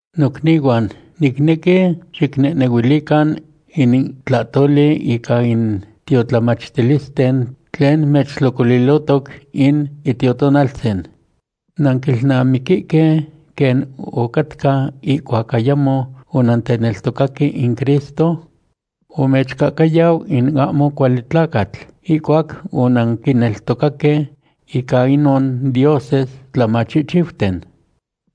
Nocnihuan, nicnequi xicnehnehuilican in tlahtoli ica in tiotlamatilisten tlen mechtlocolilohtoc in Itiotonaltzin. Nanquilnamiquihque quen ocatca ihcuac ayamo onanteneltocaque in Cristo. Omechcahcayau in ahmo cuali tlacatl ihcuac onanquineltocaque ica inon dioses tlamachihchiuten.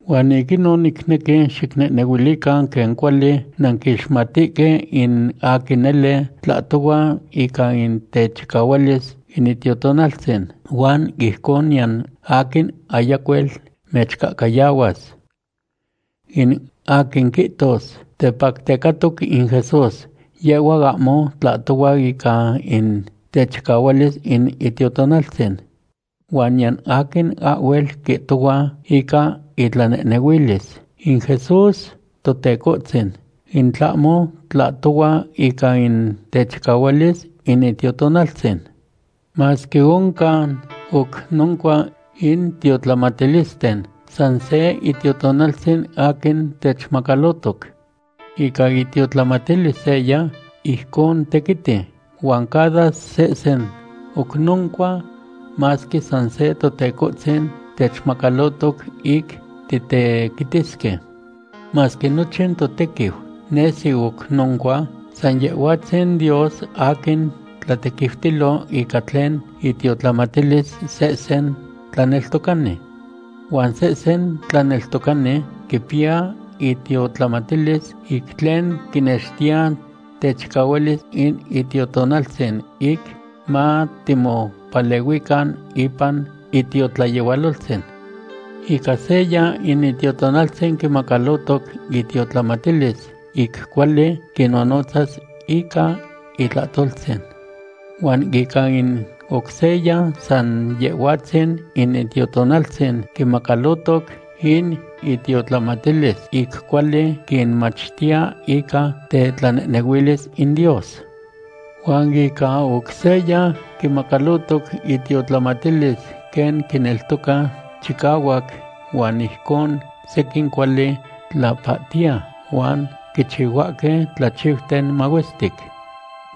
Huan ic inon nicnequi xicnehnehuilican quen cuali nanquixmatihque in aquin nele tlahtohua ica in techicahualis in Itiotonaltzin, huan ijcon niyan aquin ayacuel mechcahcayahuas. In aquin quihtos: “Tepactecatoc in Jesús”, yehhua ahmo tlahtohua ica in techicahualis in Itiotonaltzin. Huan niyan aquin ahhuel quihtohua ica itlanehnehuilis: “In Jesús Totecohtzin”, in tlahmo tlahtohua ica in techicahualis in Itiotonaltzin. Masque oncan oc noncua in tiotlamatilisten, san se Itiotonaltzin aquin techmacalotoc. Ica itiotlamatilis seya, ijcon tequiti, huan cada sehsen oc noncua, masque san se Totecohtzin techmacalohtoc ic titequitisque. Masque nochin totequiu nesi oc noncua, san Yehhuatzin Dios aquin tlatequiutilo ica tlen itiotlamatilis sehsen tlaneltocani. Huan sehsen tlaneltocani quipiya itiotlamatilis ic tlen quinextiya techicahualis in Itiotonaltzin ic matimopalehuican ipan itiotlayehualoltzin. Ica seya in Itiotonaltzin quimacalohtoc itiotlamatilis ic cuali quinnonotzas ica itlahtoltzin. Huan ica in oc seya san Yehhuatzin in Itiotonaltzin quimacalohtoc in itiotlamatilis ic cuali quinmachtiya ica tetlanehnehuilis in Dios. Huan ica oc seya quimacalohtoc itiotlamatilis quen quineltoca chicahuac huan ijcon sequin cuali tlapahtiya huan quichihuahque tlachiuten mahuestic.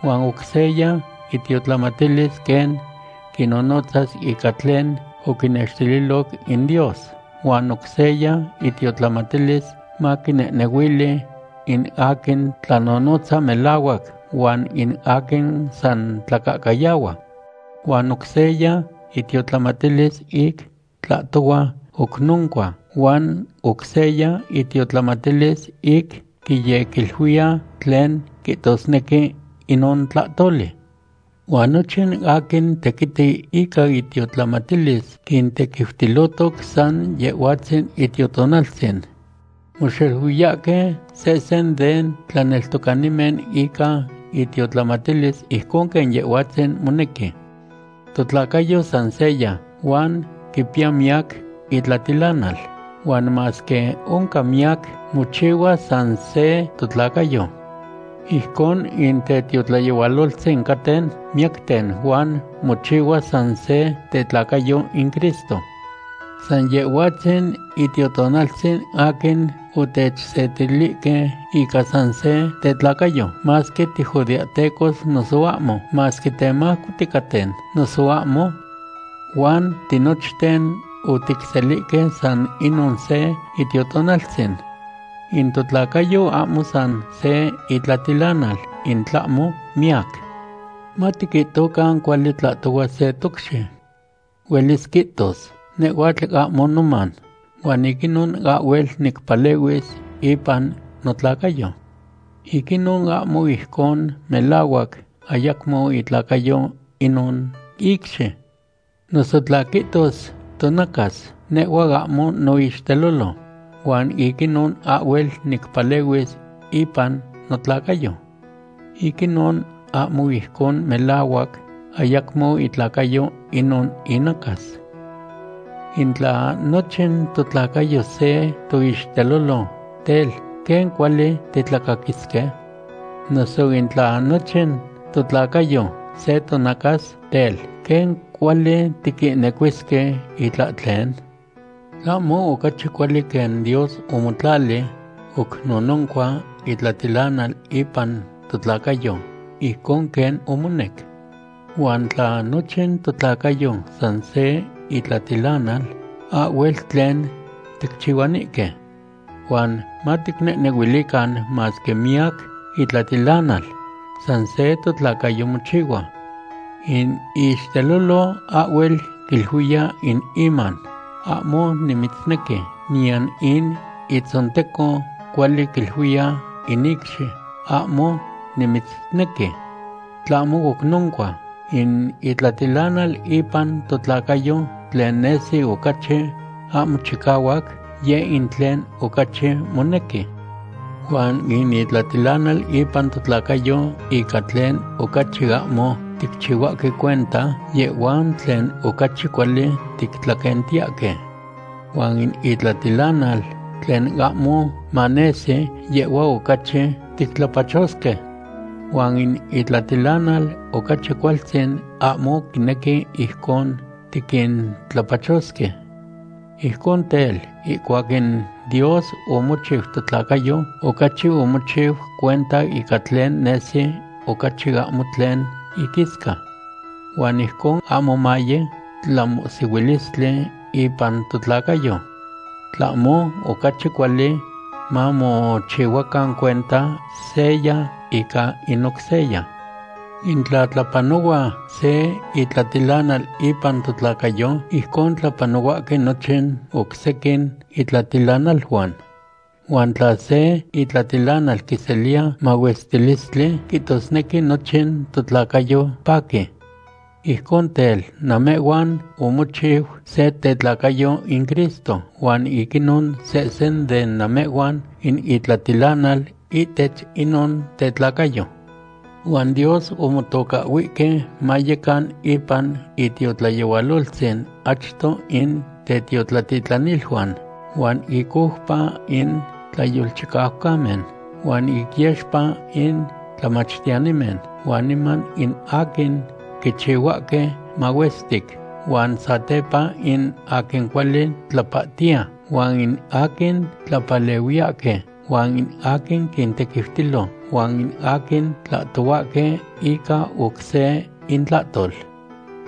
Huan oc seya itiotlamatilis quen quinonotzas ica tlen oquinextililoc in Dios, huan oc seya itiotlamatilis maquinehnehuili in aquin tlanonotza melahuac huan in aquin san tlacahcayahua. Huan oc seya itiotlamatilis ic tlahtohua oc noncua huan oc seya itiotlamatilis ic quiyequiluiya tlen quihtosnequi inon tlahtoli. Huan nochin aquin tequiti ica itiotlamatilis quintequiutilohtoc san Yehhuatzin Itiotonaltzin. Moxeluiyahque sehsen den tlaneltocanimen ica itiotlamatilis ijcon quen Yehhuatzin monequi. Totlacayo san seya, huan quipiya miyac itlatilanal, huan masque oncan miyac, mochihua san se totlacayo. Ijcon in tetiotlayehualoltzin caten miyacten huan mochihua san se tetlacayo in Cristo. San Yehhuatzin Itiotonaltzin aquin otechsetilihque ica san se tetlacayo, masque tijudeahtecos noso ahmo; masque temajco ticaten, noso ahmo. Huan tinochten otiteselihque san inon se Itiotonaltzin. In totlacayo ahmo san se itlatilanal in tlahmo miyac. Matiquihtocan cuali tlahtohua se tocxi. Huelis quihtos: “Nehhuatl ahmo noman, huan ic inon ahhuel nicpalehuis ipan notlacayo.” Ic inon ahmo ijcon melahuac ayacmo itlacayo inon icxi. Noso tla quihtos tonacas: “Nehhua ahmo noixtelolo huan ic inon ahhuel nicpalehuis ipan notlacayo.” Ic inon ahmo ijcon melahuac ayacmo itlacayo inon inacas. In tla nochin totlacayo se toixtelolo, tel, ¿quen cuali titlacaquisque? Noso in tla nochin totlacayo se tonacas, tel, ¿quen cuali tiquihnecuisque itlahtlen? Tlahmo ocachi cuali quen Dios omotlali oc nononcua itlatilanal ipan totlacayo ojcon quen omonec. Huan tla nochin totlacayo san se itlatilanal, ahhuel tlen ticchihuanihque. Huan maticnehnehuilican masque miyac itlatilanal, san se totlacayo mochihua. In ixtelolo ahhuel quiluiya in iman: “Ahmo nimitznequi”, niyan in itzonteco cuali quiluiya in icxi: “Ahmo nimitznequi.” Tlahmo oc noncua, in itlatilanal ipan totlacayo tlen nesi ocachi ahmo chicahuac, yeh in tlen ocachi monequi. Huan in itlatilanal ipan totlacayo ica tlen ocachi ahmo ticchihuahque cuenta, yehhuan tlen ocachi cuali tictlaquentiyahque. Huan in itlatilanal tlen ahmo manesi, yehhua ocachi tictlapachosque. Huan in itlatilanal ocachi cualtzin ahmo quinequi ijcon tiquintlapachosque. Ijcon tel, ihcuac in Dios omochiu totlacayo, ocachi omochiu cuenta ica tlen nesi ocachi ahmo tlen iquisca. Huan ijcon ahmo maye tlamohsihuilistli ipan totlacayo. Tlahmo ocachi cuali, mamochihuacan cuenta seya ica in oc seya. In tla tlapanohua se itlatilanal ipan totlacayo, ijcon tlapanohuahque nochin oc sequin itlatilanaluan. Huan tla se itlatilanal quiseliya mahuestilistli, quihtosnequi nochin totlacayo paqui. Ijcon tel, namehhuan omochiu se tetlacayo in Cristo huan ic inon sehsen de namehhuan in itlatilanal ihtech inon tetlacayo. Huan Dios omotocahhuihque mayecan ipan itiotlayehualoltzin achto in tetiotlatitlaniluan, huan ic oupa in tlayolchicaucamen, huan ic yexpa in tlamachtiyanimen, huan niman in aquin quichihuahque mahuestic huan satepa in aquin cuali tlapahtiya, huan in aquin tlapalehuiyahque, huan in aquin quintequiutilo, huan in aquin tlahtohuahque ica oc se intlahtol.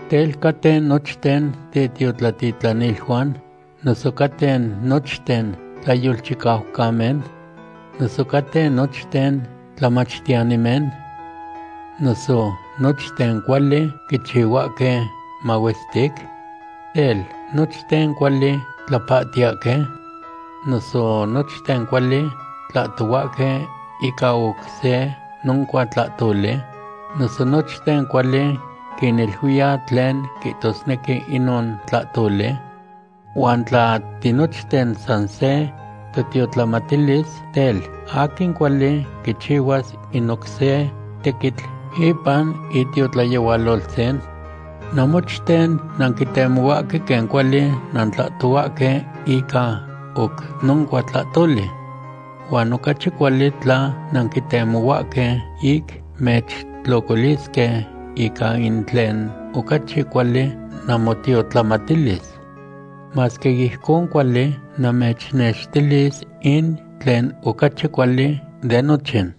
Tel, ¿caten nochten tetiotlatitlaniluan? ¿Noso caten nochten tlayolchicaucamen? ¿Noso caten nochten tlamachtiyanimen? ¿Noso nochten cuali quichihuahque mahuestic? Tel, ¿nochten cuali tlapahtiyahque? ¿Noso nochten cuali tlahtohuahque ica oc noncua tlahtoli? ¿Noso nochten cuali quiniluiya tlen quihtosnequi inon tlahtoli? Huan tla tinochten san se totiotlamatilis, tel, ¿aquin cuali quichihuas in oc se tequitl ipan itiotlayehualoltzin? Namochten nanquitemohuahque quen cuali nantlahtohuahque ica oc noncua tlahtoli. Huan ocachi cuali tla nanquitemohuahque ic mechtlocolisque ica in tlen ocachi cuali namotiotlamatilis. Masque ijcon cuali, namechnextilis in tlen ocachi cuali de nochin.